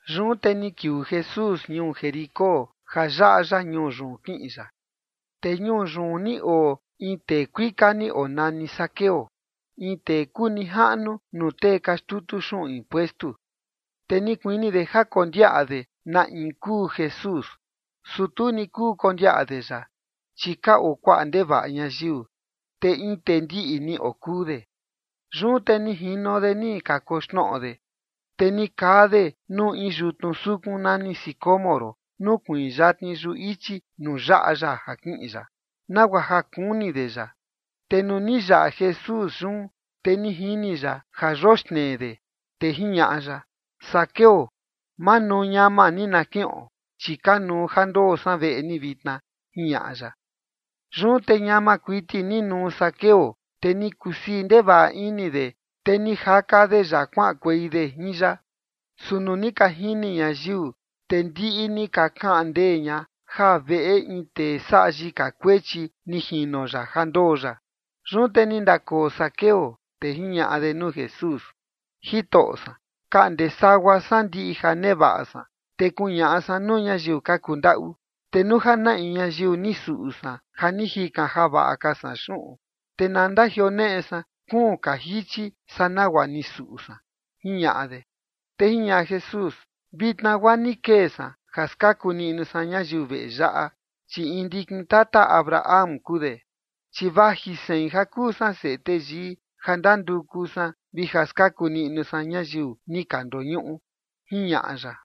Yun te ni kiuu Jesús ñuu Jericó ja yaꞌa ya ñuu yun kiꞌin ya. Te ñuu yun ni oo in tee kuika ni onani Zaqueo, in tee kuu nijaꞌnu nuu tee ka xtutu xuꞌun impuestu. Te ni kuini de ja kondiaꞌa de na in kuu Jesús, su tu ni kuu kondiaꞌa de ya, chi ka oo kuaꞌa ndevaꞌa ñayiu, te in tee ndiꞌi ni okuu de. Yun te ni jino de ni kakoxnoꞌo de, te ni kaa de nuu in yutnu sukun nani sicómoro nukuiin yatni yuꞌu ichi nuu yaꞌa ya ja kiꞌin ya, nagua ja kuni de ya. Te nuu ni yaꞌa Jesús yun, te ni jini ya ja yoxnee de, te jiñaꞌa ya: ―Zaqueo, manuu ñama ni na kiꞌon, chi kanuu ja ndoo san veꞌe ni vitna ―jiñaꞌa ya. Yun te ñama kuiti ni nuu Zaqueo, te ni kusii ndevaꞌa ini de, te ni jaka de ya, kuaꞌankuei de jin ya. Su nuu ni ka jini ñayiu, te ndiꞌi ni ka kaꞌan ndee ña ja veꞌe in tee saꞌa yika kuechi ni jino ya ja ndoo ya. Yun te ni ndakoo Zaqueo, te jiñaꞌa de nuu Jesús: ―Jitoꞌo san, kaꞌnde sagua san ndiꞌi ja nevaꞌa san, te kuñaꞌa san nuu ñayiu ka kundaꞌu. Te nuu ja na in ñayiu ni suꞌu san ja ni jikan javaꞌa ka san xuꞌun, te na ndajioneꞌe san kuun ka jichi saa nagua ni suꞌu san ―jiñaꞌa de. Te jiñaꞌa Jesús: ―Vitna guaa ni kee san ja skaku niꞌnu san ñayiu veꞌe yaꞌa, chi in ndikin tata Abraham kuu de. Chi vaji sein, ja kuu san Seꞌe Teyii, ja ndanduku san vi ja skaku niꞌnu san ñayiu ni ka ndoñuꞌu ―jiñaꞌa ya.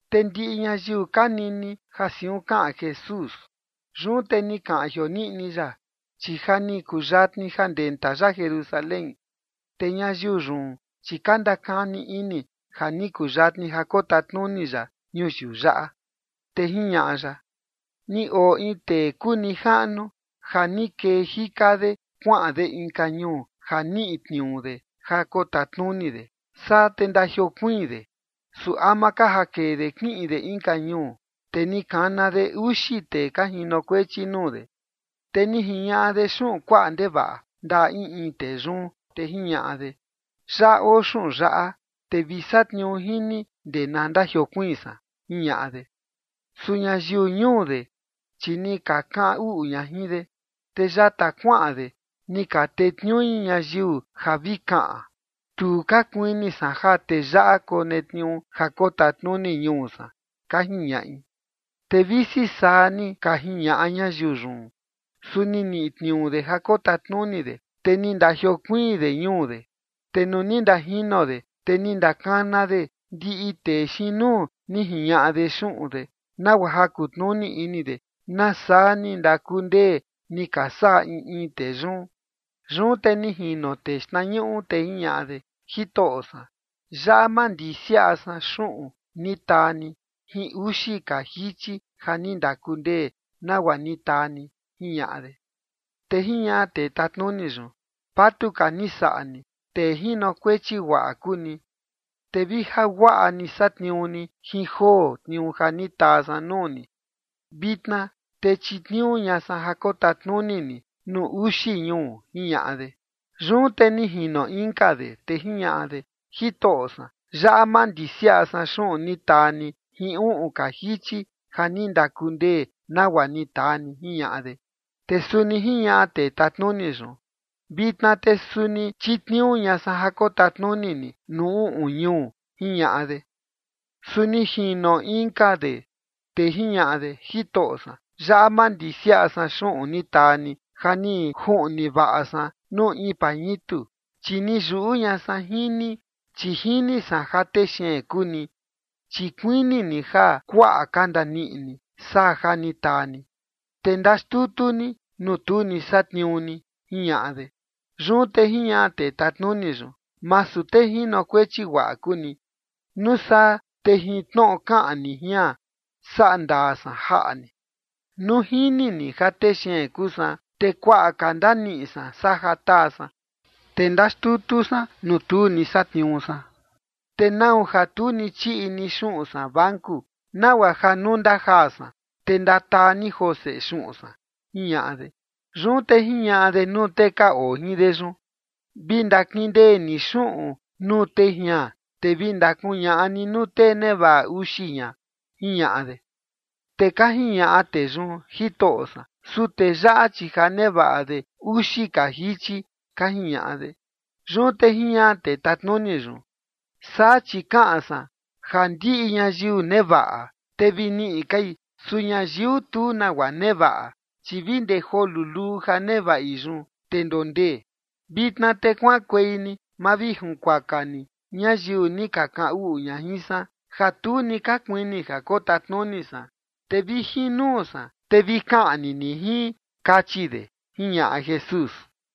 Te ndiꞌi ñayiu ka nini ja siun kaꞌan Jesús. Yun te ni kaꞌan jioniꞌni ya, chi ja ni kuyatni ja ndenta ya Jerusalén. Te ñayiu yun, chi ka ndakani ini ja ni kuyatni ja kotatnuni ya ñuyiu yaꞌa. Te jiñaꞌa ya: ―Ni oo in tee kuu nijaꞌnu ja ni kee jika de kuaꞌan de inka ñuu ja niꞌi tniuu de ja kotatnuni de, saa te ndajiokuiin de. Su ama ka ja kee de kiꞌin de inka ñuu, te ni kana de uxi tee ka jinokuechi nuu de, te ni jiñaꞌa de xuꞌun kuaꞌa ndevaꞌa ndaꞌa in in tee yun. Te jiñaꞌa de: “Yaꞌa oo xuꞌun yaꞌa, te vi satniuu jin ni ndee na ndajiokuiin san”, jiñaꞌa de. Su ñayiu ñuu de, chi ni ka kaꞌan uꞌu ña jin de. Te yata kuaꞌan de, ni ka tetniui ñayiu ja vi kaꞌan: “Tu ka kuini san ja tee yaꞌa konetniuu ja kotatnuni ñuu san”, ka jiñaꞌi. Te visi saa ni ka jiñaꞌa ñayiu yun, su ni niꞌi tniuu de ja kotatnuni de, te ni ndajiokuiin de ñuu de. Te nuu ni ndajino de, te ni ndakana de ndiꞌi tee xiin nuu ni jiñaꞌa de xuꞌun de, nagua ja kutnuni ini de nasaa ni ndakundee ni ka saꞌa in in tee yun. Yun te ni jino tee xtnañuꞌu, te jiñaꞌa de: “Jitoꞌo san, yaꞌa mandisiaꞌa san xuꞌun ni taa ni jin uxi ka jichi ja ni ndakundee nagua ni taa ni”, jiñaꞌa de. Te jiñaꞌa tee tatnuni yun: “Vatuka ni saꞌa ni. Tee jinokuechi guaꞌa kuu ni. Te vi ja guaꞌa ni satniuu ni jin joo tniuu ja ni taa san nuu ni, vitna te chitniuu ña san ja kotatnuni ni nuu uxi ñuu”, jiñaꞌa de. Yun te ni jino inka de, te jiñaꞌa de: “Jitoꞌo san, yaꞌa mandisiaꞌa san xuꞌun ni taa ni jin uꞌun ka jichi ja ni ndakundee nagua ni taa ni”, jiñaꞌa de. Te suni jiñaꞌa tee tatnuni yun: “Vitna te suni chitniuu ña san ja kotatnuni ni nuu uꞌun ñuu”, jiñaꞌa de. Su ni jino inka de, te jiñaꞌa de: “Jitoꞌo san, yaꞌa mandisiaꞌa san xuꞌun ni taa ni ja ni juꞌni vaꞌa san nuu in pañitu. Chi ni yuꞌu ña san jin ni, chi jini san ja tee xeen kuu ni, chi kuini ni ja kuaꞌa ka ndaniꞌi ni saa ja ni taa ni, te ndaxtutu ni, nuu tu ni satniuu ni”, jiñaꞌa de. Yun te jiñaꞌa tee tatnuni yun: “Masu tee jinokuechi guaꞌa kuu ni. Nuu saa te jin tnoꞌo kaꞌan ni jian, saꞌa ndaa san jaꞌa ni. Nuu jini ni ja tee xeen kuu san, te kuaꞌa ka ndaniꞌi san saa ja taa san, te ndaxtutu san nuu tu ni satniuu san, te ¿nau ja tu ni chiꞌi ni xuꞌun san banku nagua ja nuu ndajaa san, te ndataa ni joo seꞌe xuꞌun san?”, jiñaꞌa de. Yun te jiñaꞌa de nuu tee ka oo jin de yun: “Vi ndakindee ni xuꞌun nuu tee jian, te vi ndakuñaꞌa ni nuu tee nevaꞌa uxi jian”, jiñaꞌa de. Te ka jiñaꞌa tee yun: “Jitoꞌo san, su tee yaꞌa, chi ja nevaꞌa de uxi ka jichi”, ka jiñaꞌa de. Yun te jiñaꞌa tee tatnuni yun: “Saa chi kaꞌan san ja ndiꞌi ñayiu nevaꞌa, te vi niꞌi kai. Su ñayiu tu nagua nevaꞌa, chi vi ndee joo luluu ja nevaꞌi yun, te ndondee. Vitna te kuaꞌankuei ni mavijinkuaka ni ñayiu ni ka kaꞌan uꞌu ña jin san, ja tu ni ka kuini ja kotatnuni san, te vi jin nuu san, te vi kaꞌni ni jin”, kachi de ―jiñaꞌa Jesús.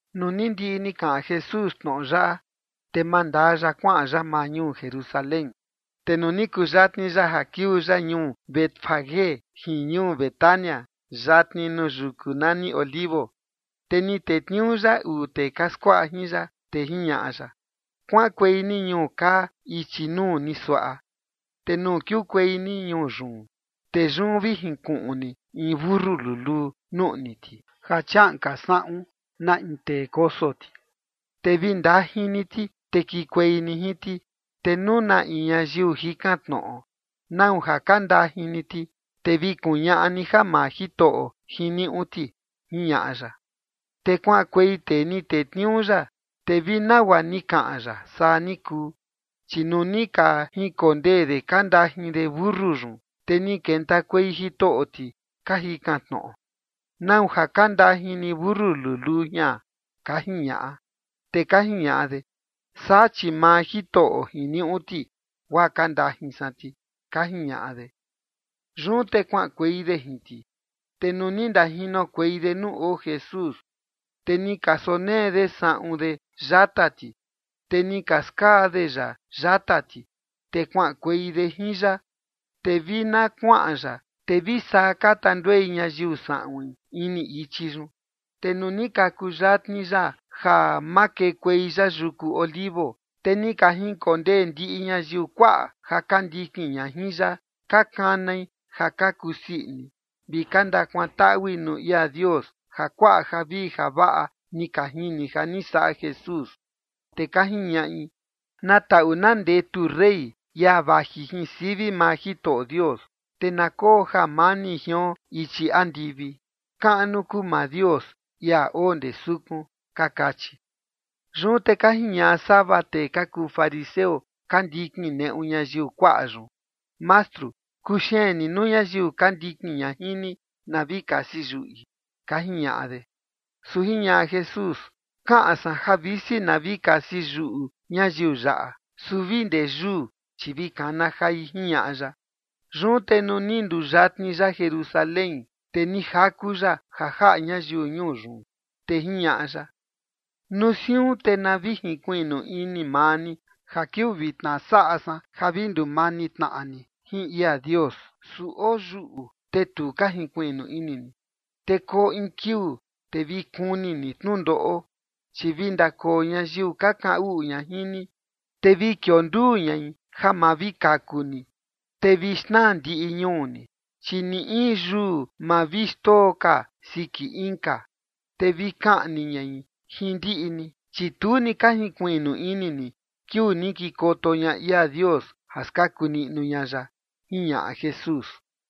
Nuu ni ndiꞌi ni kaꞌan Jesús tnoꞌo yaꞌa, te mandaa ya kuaꞌan ya maa ñuu Jerusalén. Te nuu ni kuyatni ya ja kiuu ya ñuu Betfagé jin ñuu Betania yatni nuu yuku nani Olivos, te ni tetniuu ya uu tee ka skuaꞌa jin ya, te jiñaꞌa ya: ―Kuaꞌankuei ni ñuu kaa ichi nuu ni suaꞌa. Te nuu kiukuei ni ñuu yun, te yun vi jinkuꞌun ni in mentu luluu, nuꞌni ti, ja chiaꞌan ka saꞌun na in tee koso ti. Te vi ndajin ni ti, te kikuei ni jin ti. Te nuu na in ñayiu jikan tnoꞌo: “¿Nau ja ka ndajin ni ti?”, te vi kuñaꞌa ni ja maa Jitoꞌo jiniuꞌu ti ―jiñaꞌa ya. Te kuaꞌankuei tee ni tetniuu ya, te vi nagua ni kaꞌan ya, saa ni kuu. Chi nuu ni ka jinkondee de ka ndajin de mentu yun, te ni kentakuei jitoꞌo ti ka jikan tnoꞌo: ―¿Nau ja ka ndajin ni mentu luluu jian? ―ka jiñaꞌa. Te ka jiñaꞌa de: ―Saa, chi maa Jitoꞌo jiniuꞌu ti, guaa ka ndajin san ti ―ka jiñaꞌa de. Yun te kuaꞌankuei de jin ti. Te nuu ni ndajinokuei de nuu oo Jesús, te ni ka sonee de saꞌun de yata ti, te ni ka skaa de ya yata ti, te kuaꞌankuei de jin ya. Te vi na kuaꞌan ya, te vi saa ka tanduei ñayiu saꞌuin ini ichi yun. Te nuu ni ka kuyatni ya ja makekuei ya yuku Olivos, te ni ka jinkondee ndiꞌi ñayiu kuaꞌa ja ka ndikin ña jin ya ka kanai ja ka kusii ini vi ka ndakuantaꞌui nuu ia Dios ja kuaꞌa javii javaꞌa ni ka jini ja ni saꞌa Jesús. Te ka jiñaꞌi: ―Na taꞌu na ndetu rey, ia vaji jin sivi maa Jitoꞌo Dios, te na koo jamani jion ichi andivi. Kaꞌnu kuu maa Dios, ia oo ndee sukun ―ka kachi. Yun te ka jiñaꞌa sava tee ka kuu fariseo ka ndikin neꞌu ñayiu kuaꞌa yun: ―Mastru, kuxeen ni nuu ñayiu ka ndikin ña jin ni na vi kasi yuꞌi ―ka jiñaꞌa de. Su jiñaꞌa Jesús: ―Kaꞌan san ja visi na vi kasi yuꞌu ñayiu yaꞌa, su vi ndee yuu, chi vi kana jai ―jiñaꞌa ya. Yun te nuu ni nduyatni ya Jerusalén, te ni jaku ya ja jaꞌa ñayiu ñuu yun. Te jiñaꞌa ya: ―Nuu siun te na vi jinkuiꞌnu ini maa ni ja kiuu vitna saꞌa san ja vi ndumani tnaꞌa ni jin ia Dios, su oo yuꞌu, te tu ka jinkuiꞌnu ini ni. Te koo in kiuu, te vi kuni ni tnundoꞌo, chi vi ndakoo ñayiu ka kaꞌan uꞌu ña jin ni, te vi kionduu ñai ja ma vi kaku ni. Te vi xnaa ndiꞌi ñuu ni, chi ni in yuu ma vi xndoo ka siki inka. Te vi kaꞌni ñai jin ndiꞌi ni, chi tu ni ka jinkuiꞌnu ini ni kiuu ni kikoto ña ia Dios ja skaku niꞌnu ña ya ―jiñaꞌa Jesús.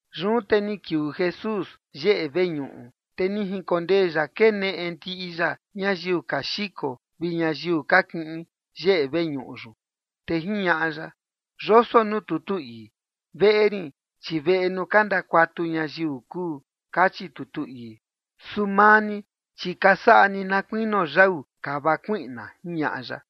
Yun te ni kiuu Jesús yeꞌe veñuꞌu, te ni jinkondee ya keneꞌe ndiꞌi ya ñayiu ka xiko vi ñayiu ka kiꞌin yeꞌe veñuꞌu yun. Te jiñaꞌa ya: ―Yoso nuu tutu ii: “Veꞌe rin chi veꞌe nuu ka ndakuatu ñayiu kuu”, kachi tutu ii. Su maa ni, chi ka saꞌa ni na kuinio yau kava kuiꞌna ―jiñaꞌa ya.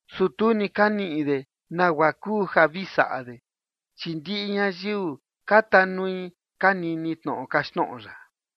Su tu ni ka niꞌi de nagua kuu ja vi saꞌa de, chi ndiꞌi ñayiu ka tanui ka nini tnoꞌo kaxtnoꞌo ya.